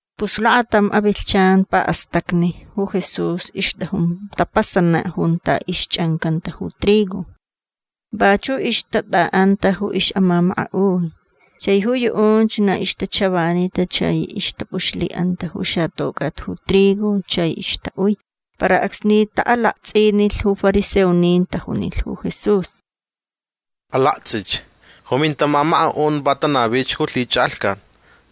Pus lakatam avilhchan paʼastacni ju Jesús ixtʼajun tapasanaʼ junta ixchʼancanta ju trigo. Vachuʼ ixtatʼaʼanta ju ixʼamamakaʼui. Chai ju yuʼunch na ixtachavanita chai ixtapʼuxlhiʼanta ju xatocʼat ju trigo chai ixtaʼui. Para acsni taʼalaktsʼinilh ju fariseonin tajunilh ju Jesús: ―Alaktsʼich. Ju mintamamakaʼun va tanavich ju lhichʼalhcat.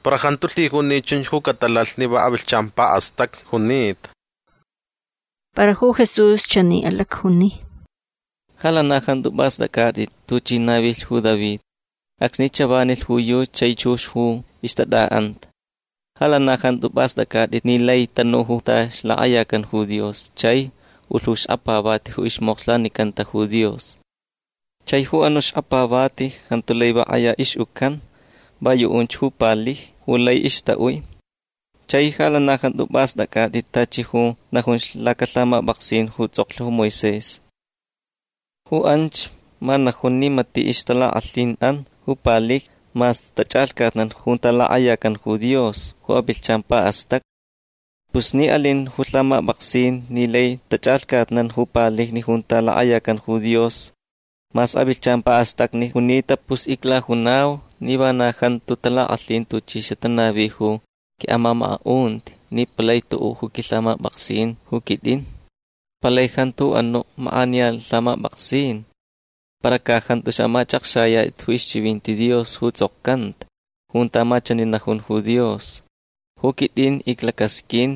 Para jantu lhijun ni chunch ju catalalh ni va avilhchan paʼastacni junita. Para ju Jesús chani alacjuni: ―Ja lana jantu pʼastʼacʼatʼit tuchi navilh ju David acsni chavanilh ju yuchi chai chux ju ixtatʼaʼanta. Ja lana jantu pʼastʼacʼatʼit ni lai tanu junta ixlakʼayacan ju Dios chai ulh ju xkapavati ju ismokslanicanta ju Dios. Chai ju anuʼ xkapavati jantu lai va kʼaya ixʼucan. Va yuʼunch ju palijni ju lai ixtaʼui. Chai ja lana jantu pʼastʼacʼatʼit tachi ju najun lacalhamapʼaksin ju tsʼoklh ju Moisés. Ju anch ma najun ni matiʼ ixtalakʼalhinʼan ju palijni mas tachʼalhcatnan junta lakʼayacan ju Dios ju avilhchan paʼastacni. Pus ni alin ju lhamapʼaksin ni lai tachʼalhcatnan ju palijni junta lakʼayacan ju Dios mas avilhchan paʼastacni junita pus iclajunau ni vana jantu talakʼalhin tuchi xatanavi ju quiʼamamakaʼunti ni palai tuʼuʼ ju quilhamapʼaksin ju quitʼin. Palai jantu ju anuʼ makʼaniya lhamapʼaksin. Para ca jantu xamachʼakxayatʼit ju ixchivinti Dios ju tsʼokcanta junta ma chani najun ju Dios: “Ju quitʼin iclacasqʼuin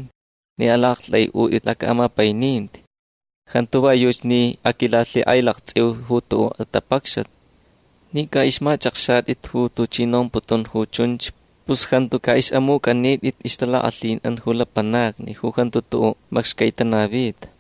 ni alaʼaktʼaiʼutʼit lacaʼamapaininti. Jantu va yuchi ni aquilalhikʼailaktsʼiu ju tuʼuʼ atapacxat”. Ni ca ixmachʼakxatʼit ju tuchi nomputun ju chunch pus jantu caʼixʼamucʼanitʼit ixtalakʼalhinʼan ju lapanacni ju jantu tuʼuʼ macxcai tanavita.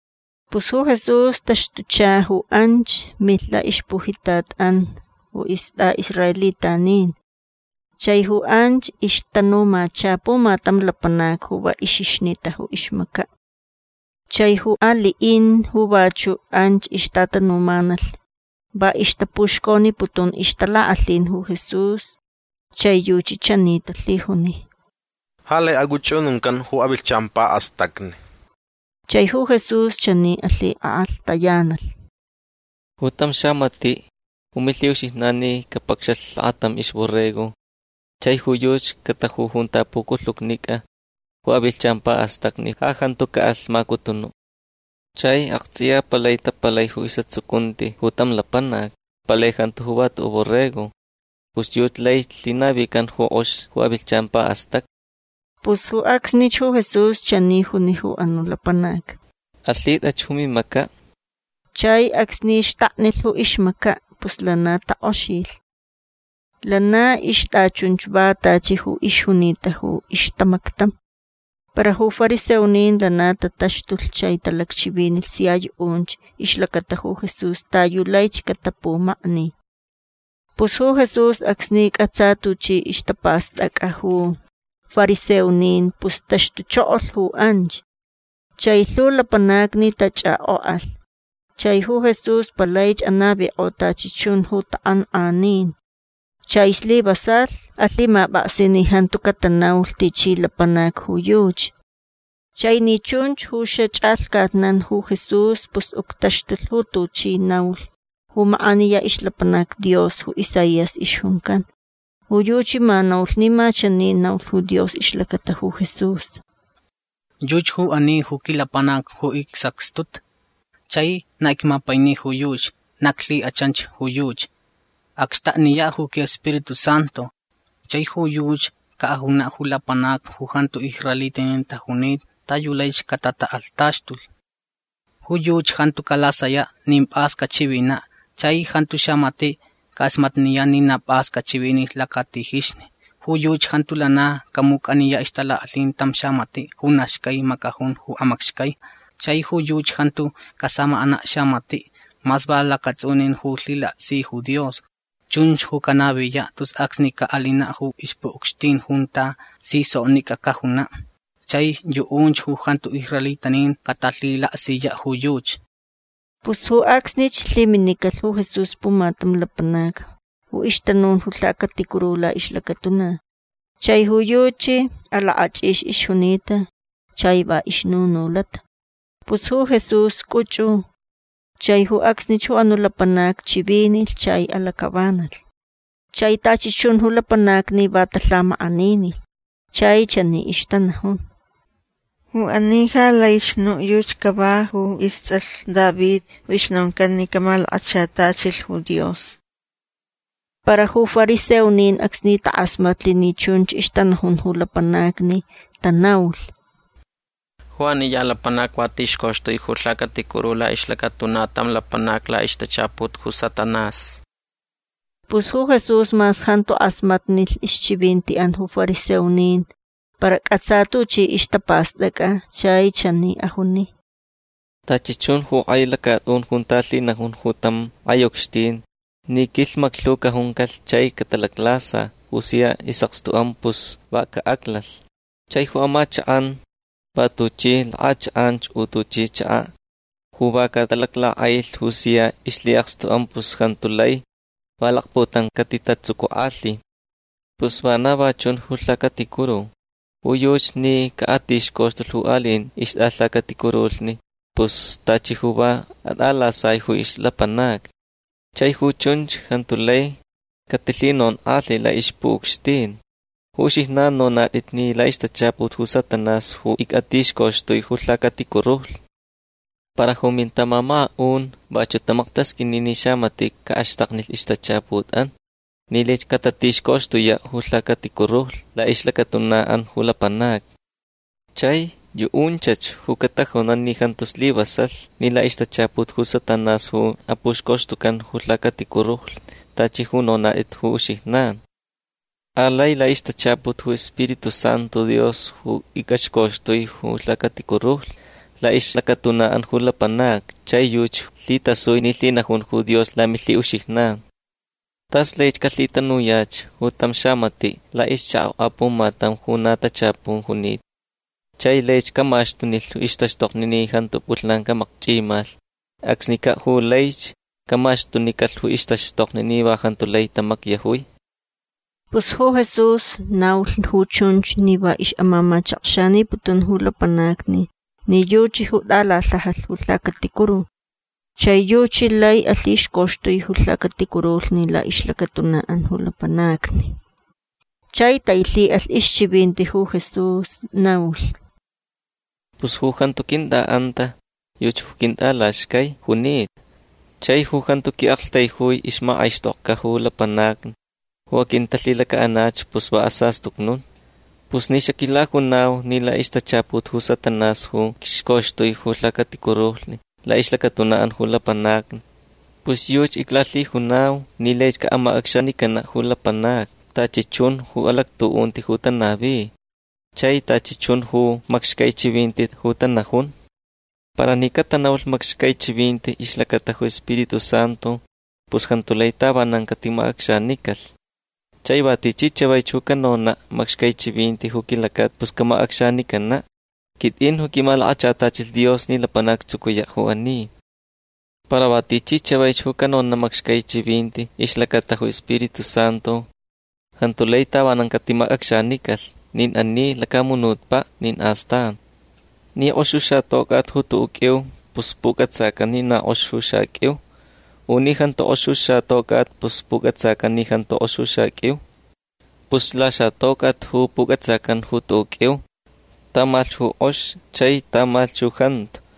Pus ju Jesús taxtucha ju anch. Milh laʼixpujitatʼan ju istʼaʼisraelitanin. Chai ju anch ixtanumacha pumatam lapanac ju va ixixnita ju ixmacaʼ. Chai ju aliʼin ju vachuʼ anch ixtatanumanalh va ixtapuxconiputun ixtalakʼalhin ju Jesús. Chai yuchi chani talhijuni: ―Ja lai acʼuchʼununcan ju avilhchan paʼastacni. Chai ju Jesús chani alhikʼalhtayanalh: ―Ju tam xamatiʼ ju milhiʼuxijnan ni capacxalh lakatam ixborrego chai ju yuchi cataju junta puculhucnicʼa ju avilhchan paʼastacni ja jantu caʼalh macutunuʼ. Chai aktsʼiya palai tapalai ju isʼatsucunti ju tam lapanac. Palai jantu ju va tuʼuʼ borrego. Pus yuchi lai lhinavican ju kʼox ju avilhchan paʼastacni. Pus ju acsnich ju Jesús chani juni ju anuʼ lapanac: ―Alhitʼach ju mimacaʼ. Chai acsni xtaknilh ju ixmacaʼ pus lana takʼoxilh. Lana ixtʼachunch va tachi ju ixjunita ju ixtamactam. Para ju fariseonin lana tataxtulh chai talacchivinilh sia yuʼunch ixlacata ju Jesús ta yu laich catapumakni. Pus ju Jesús acsni cʼatsa tuchi ixtapastʼacʼa ju fariseonin pus taxtuchokolh ju anch. Chai lhu lapanacni tachʼakʼokʼalh. Chai ju Jesús palaich anavikʼo tachi chun ju takʼankʼanin. Chai slivasalh alhimapʼaksi ni jantu catanaulh tichi lapanac ju yuchi. Chai ni chunch ju xachʼalhcatnan ju Jesús pus uctaxtulh ju tuchi naulh ju makʼaniya ixlapanac Dios ju Isaías ixjuncan. Ju yuchi ma naulh ni ma chani naulh ju Dios ixlacata ju Jesús: Yuchi ju ani ju quilapanac ju icsacxtuta. Chai na icmapaini ju yuchi. Na iclhikʼachan ju yuchi. Acxtakniyaʼ ju quiSpiritu Santu. Chai ju yuchi caʼajunaʼ ju lapanacni ju jantu israelitanin tajunita ta yu laich catatakʼalhtaxtulh. Ju yuchi jantu calasayaʼ nin pʼas cachivinaʼ. Chai jantu xamatiʼ cakʼasmatniyaʼ ni na pʼas cachivinilh lacatijixni. Ju yuchi jantu lana camucʼaniyaʼ ixtalakʼalhin tam xamatiʼ ju na xcai macajun ju amacxcai. Chai ju yuchi jantu casamakʼanaʼ xamatiʼ mas va lacatsʼunin ju lhilaksi ju Dios. Chunch ju canaviyaʼ tus acsni caʼalinaʼ ju ixpuʼucxtin junta si soknicʼa cajunaʼ. Chai yuʼunch ju jantu israelitanin catalhilaksiyaʼ ju yuchi. Pus ju acsnich lhiminicalh ju Jesús pumatam lapanac ju ixtanun ju lhacaticuru laʼixlacatuna. Chai ju yuchi alakʼachʼix ixjunita chai va ixnunulata. Pus ju Jesús cʼuchʼu. Chai ju acsnich ju anuʼ lapanac chivinilh chai alacʼavanalh. Chai tachi chun ju lapanacni va talhamakʼaninilh. Chai chani ixtanajun: ―Ju ani ja laich nuʼ yuchi cava ju istsʼalh David. Ju ixnoncan ni camalakachatachilh ju Dios. Para ju fariseonin acsni takʼasmatlh ni chunch ixtanajun ju lapanacni tanaulh: ―Ju ani ya lapanac va tixcoxtui ju lhacaticuru laʼixlacatuna tam lapanac laʼixtachaput ju Satanás. Pus ju Jesús mas jantu kʼasmatnilh ixchivintiʼan ju fariseonin para cʼatsa tuchi ixtapastʼacʼa chai chani ajuni: ―Tachi chun ju kʼai lacatʼun junta lhinajun ju tam kʼai ucxtin ni quilhmaclhu cajuncalh chai catalaclasa ju sia isʼakstuʼan pus va caʼaclalh. Chai ju amachakʼan va tuchi lakʼachakʼan u tuchi chakaʼ ju va catalaclakʼailh ju sia ixlhiʼakstuʼan pus jantu lai va lakputam catitatsucukʼalhi. Pus vana va chun ju lhacaticuru. Ju yuchi ni caʼatixcoxtulh ju aliʼin ixtʼalhacaticurulhni pus tachi ju va atʼalasai ju ixlapanacni. Chai ju chunch jantu lai catilhinonkʼalhi laʼixpuʼucxtin. Ju uxijnan nonatʼit ni laʼixtachaput ju Satanás ju ictixcoxtui ju lhacaticurulhni. Para ju mintamamakaʼun vachuʼ tamaktasqʼuini ni xamatiʼ caʼaxtaknilh ixtachaputʼan ni laich catatixcoxtuyaʼ ju lhacaticurulhni laʼixlacatunaʼan ju lapanacni. Chai yuʼunchach ju catajunan ni jantu slivasalh ni laʼixtachaput ju Satanás ju apuxcoxtucan ju lhacaticurulhni tachi ju nonatʼit ju uxijnan. Alai laʼixtachaput ju iSpiritu Santu Dios ju icʼaxcoxtui ju lhacaticurulhni laʼixlacatunaʼan ju lapanacni chai yuchi lhitasui ni lhinajun ju Dios lamilhiʼuxijnan. Tas laich calhitanuyach tam xamatiʼ laʼixchakaʼ apumatam ju na tachapun junita chai laich camaxtunilh ixtaxtokni ni jantu pʼulhnan camacchʼimalh. Acsnicaʼ ju laich camaxtunicalh ju ixtaxtokni ni va jantu lai tamacyajui. Pus ju Jesús naulh ju chunch ni va ixʼamamachakxaniputun ju lapanacni ni yuchi ju tʼalalhajalh ju lhacaticuru chai yuchi lai alhixcoxtui ju lhacaticurulhni laʼixlacatunaʼan ju lapanacni. Chai tailhiʼalh ixchivinti ju Jesús. Naulh: ―Pus ju jantu quintʼaʼanta yuchi ju quintʼalaxcai junita. Chai ju jantu quiʼaktaijui ixmakʼaixtʼokʼa ju lapanacni ju aquintalhilacaʼanach pus va asastucnun. Pus ni xaquilajunau ni laʼixtachaput ju Satanás ju icxcoxtui ju lhacaticurulhni laʼixlacatunaʼan ju lapanacni pus yuchi iclalhijunau ni laich caʼamacʼacxanicanaʼ ju lapanacni tachi chun ju alactuʼunti ju tanavi chai tachi chun ju macxcai chivinti ju tanajun. Para ni catanaulh macxcai chivinti ixlacata ju Spiritu Santu pus jantu lai tavanan catiʼamacʼacxanicalh. Chai va tichi chavaich ju canonaʼ macxcai chivinti ju quilacata pus camacʼacxanicanaʼ. Quitʼin ju quimalakachatachilh Dios ni lapanac actsucuyaʼ ju ani. Para va tichi chavaich ju canonaʼ macxcai chivinti ixlacata ju Spiritu Santu jantu lai tavanan catimacʼacxanicalh nin ani lacamunutpaʼ nin astan. Ni kʼox ju xatocʼat ju tuʼuʼ qʼuiu pus pucʼatsacan ni na kʼox ju xaqʼuiu. U ni jantu kʼox ju xatocʼat pus pucʼatsacan ni jantu kʼox ju xaqʼuiu. Pus laxatocʼat ju pucʼatsacan ju tuʼuʼ qʼuiu. Tamalhch ju kʼox chai tamalhch ju jantu.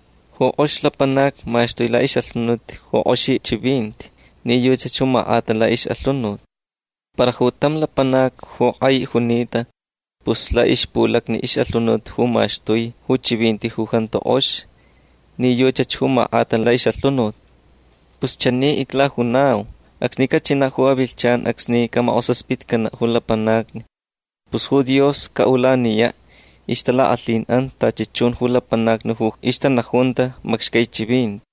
Ju kʼox lapanac maxtui laʼixʼalhunut ju kʼoxi chivinti ni yuchach ju makʼata laʼixʼalhunut. Para ju tam lapanac ju kʼai junita pus laʼixpulacni ixʼalhunut ju maxtui ju chivinti ju jantu kʼox ni yuchach ju makʼata laʼixʼalhunut. Pus chani iclajunau. Acsni cachinaʼ ju avilhchan acsni camakʼosaspitcanaʼ ju lapanacni pus ju Dios caʼulaniyaʼ ixtalakʼalhinʼan tachi chun ju lapanacni ju ixtanajunta macxcai chivinti.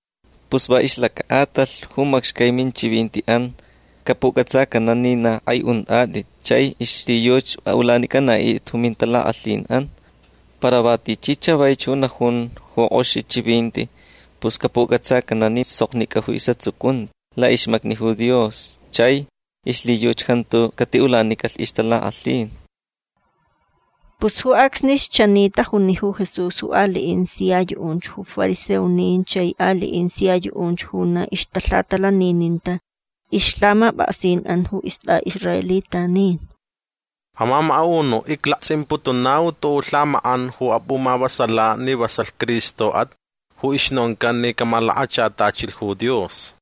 Pus va ixlacaʼatalh ju macxcai minchivintiʼan capucʼatsacanaʼ ni na kʼai untʼatʼit chai ixlhiyuchi aʼulanicʼanaʼitʼit ju mintalakʼalhinʼan. Para va tichi chavaich ju najun ju kʼoxi chivinti pus capucʼatsacanaʼ ni soknicʼa isʼatsucunti laʼixmacni Dios chai ixlhiyuchi jantu catiʼulanicalh ixtalakʼalhin. Pus ju acsnich chani tajuni ju Jesús ju aliʼin sia yuʼunch ju fariseonin chai aliʼin sia yuʼunch ju na ixtalhatalanininta ixlhamapʼaksinʼan ju istʼaʼisraelitanin. ―Amamakaʼunuʼ iclaktsʼimputunau tuʼuʼ lhamakʼan ju apʼumavasalaʼ ni vasalh Cristoʼat ju ixnoncan ni camalakachatachilh ju Dios.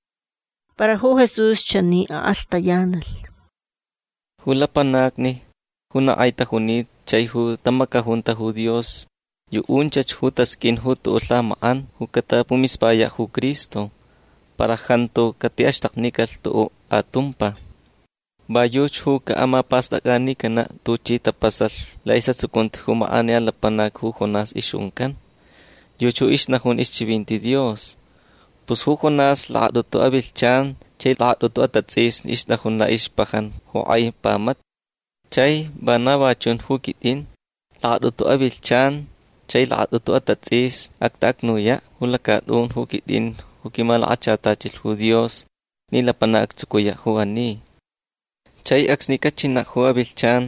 Para ju Jesús chani akʼalhtayanalh: ―Ju lapanacni ju na kʼai tajunita chai ju tamacajunta ju Dios yuʼunchach ju tasqʼuin tuʼuʼ lhamakʼan ju catapumispayaʼ ju Cristo. Para jantu catiʼaxtaknicalh tuʼuʼ atumpa. Va yuchi ju caʼamapastʼacʼanicanaʼ tuchi ju tapasalh laʼisʼatsucunti ju makʼaniya lapanacni ju Jonás ixjuncan. Yuchi ju ixnajun ixchivinti Dios. Pus ju Jonás lakatʼutu avilhchan chai lakatʼutu atatsʼisni ixtajun laʼixpajan ju kʼai pamata. Chai vana va chun ju quitʼin. Lakatʼutu avilhchan chai lakatʼutu atatsʼisni actaʼacnuyaʼ lacatʼun ju quitʼin ju quimalakachatachilh ju Dios ni lapanac actsucuyaʼ ju ani. Chai acsni cachinaʼ ju avilhchan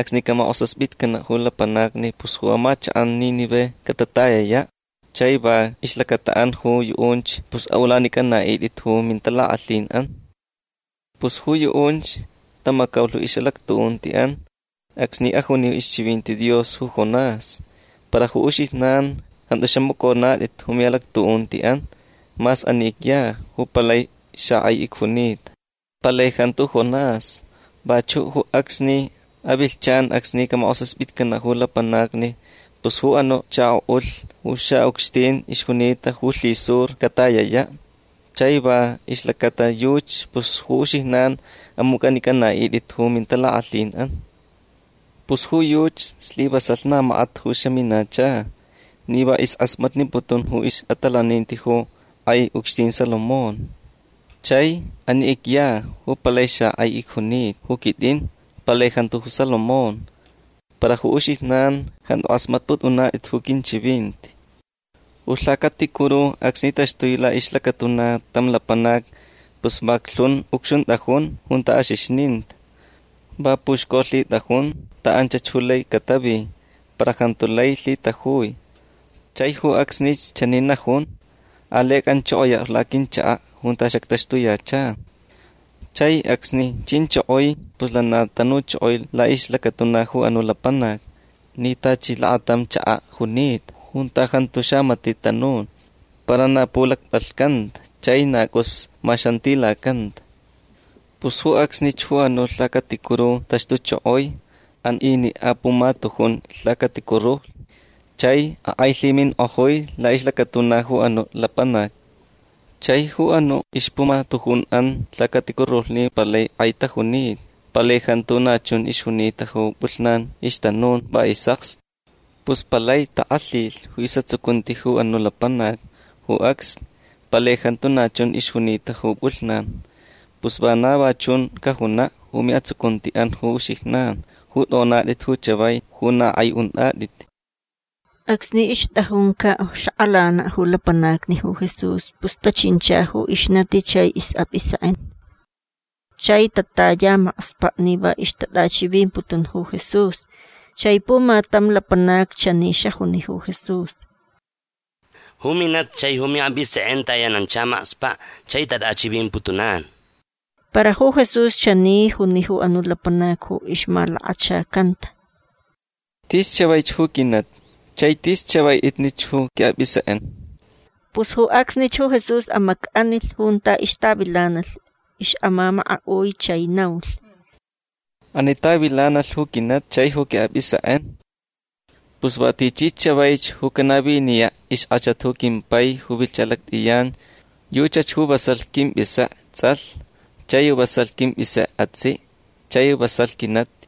acsni camakʼosaspitcanaʼ ju lapanacni pus ju amachakʼan Nínive catatayayaʼ. Chai va ixlacataʼan ju yuʼunch pus aʼulanicʼanaʼitʼit ju mintalakʼalhinʼan. Pus ju yuʼunch tamacaulh ixʼalactuʼuntiʼan acsni ajuni ixchivinti Dios ju Jonás. Para ju uxijnan jantu xamacʼonatʼit ju miʼalactuʼuntiʼan mas ani icya ju palai xakʼai icjunita. Palai jantu ju Jonás. Vachuʼ ju acsni avilhchan acsni camakʼosaspitcanaʼ ju lapanacni pus ju anuʼ chakoʼulh ju xaʼucxtin ixjunita ju lhisur catayayaʼ. Chai va ixlacata yuchi pus ju uxijnan amucʼanicʼanaʼitʼit ju mintalakʼalhinʼan. Pus ju yuchi slivasalh na makat ju xaminacha ni va iskʼasmatniputun ju ixʼatalaninti ju kʼai ucxtin Salomón. Chai ani icya ju palai xakʼai icjunita ju quitʼin. Palai jantu ju Salomón. Para ju uxijnan jantu kʼasmatpʼutʼunatʼit ju quinchivinti. Ju lhacaticuru acsni taxtui laʼixlacatuna tam lapanac pus vaclhun ucxuntʼajun junta axixninta. Va puxcolhitʼajun ta anchach ju lai catavi. Para jantu lai lhitajui. Chai ju acsnich chani najun: “Alai acʼanchokoyaʼ laquinchakaʼ junta xactaxtuyacha”. Chai acsni chinchokoi pus lana tanuchokoi laʼixlacatuna ju anuʼ lapanac ni tachi lakatam chakaʼ junita junta jantu xamatiʼ tanun para na pulacpʼalhcanta chai na cʼus maxantilacanta. Pus ju acsnich ju anuʼ lhacaticuru taxtuchokoi. An iniʼ apumatujun lhacaticurulhni chai akʼailhiminkʼojui laʼixlacatuna ju anuʼ lapanac. Chai ju anuʼ ixpumatujunʼan lhacaticurulhni palai kʼai tajunita. Palai jantu na chun ixjunita ju pʼulhnan ixtanun va isʼakstu. Pus palai takʼalhilh ju isʼatsucunti ju anuʼ lapanac ju acsni. Palai jantu na chun ixjunita ju pʼulhnan. Pus vana va chun cajunaʼ ju miʼatsucuntiʼan ju uxijnan ju tʼonatʼit ju chavai ju na kʼai untʼatʼit. Acsni ixtʼajuncaʼ xakʼalanaʼ ju lapanacni ju Jesús pus tachincha ju ixnati chai isʼapʼisekʼen. Chai tataya makspaʼ ni va ixtatʼachivimputun ju Jesús. Chai pumatam lapanac chani xajuni ju Jesús: ―Ju minati chai ju miʼapʼisekʼen tayanancha makspaʼ chai tatʼachivimputunan. Para ju Jesús chani juni ju anuʼ lapanac ju ixmalakachacanta: ―Tis chavaich ju quinati chai tis chavaʼitnich ju quiʼapʼisekʼen. Pus ju acsnich ju Jesús amacʼanilh junta ixtavilanalh ixʼamamakaʼui chai naulh: ―Ani tavilanalh ju quinati chai ju quiʼapʼisekʼen. Pus va tichi chavaich ju canaviniyaʼ ixkʼachat ju quimpai ju vilhcha lactʼiyan yuchach ju vasalh quimpʼisekʼe tsʼalh chai vasalh quimpʼisekʼe atsiʼ chai vasalh quinati.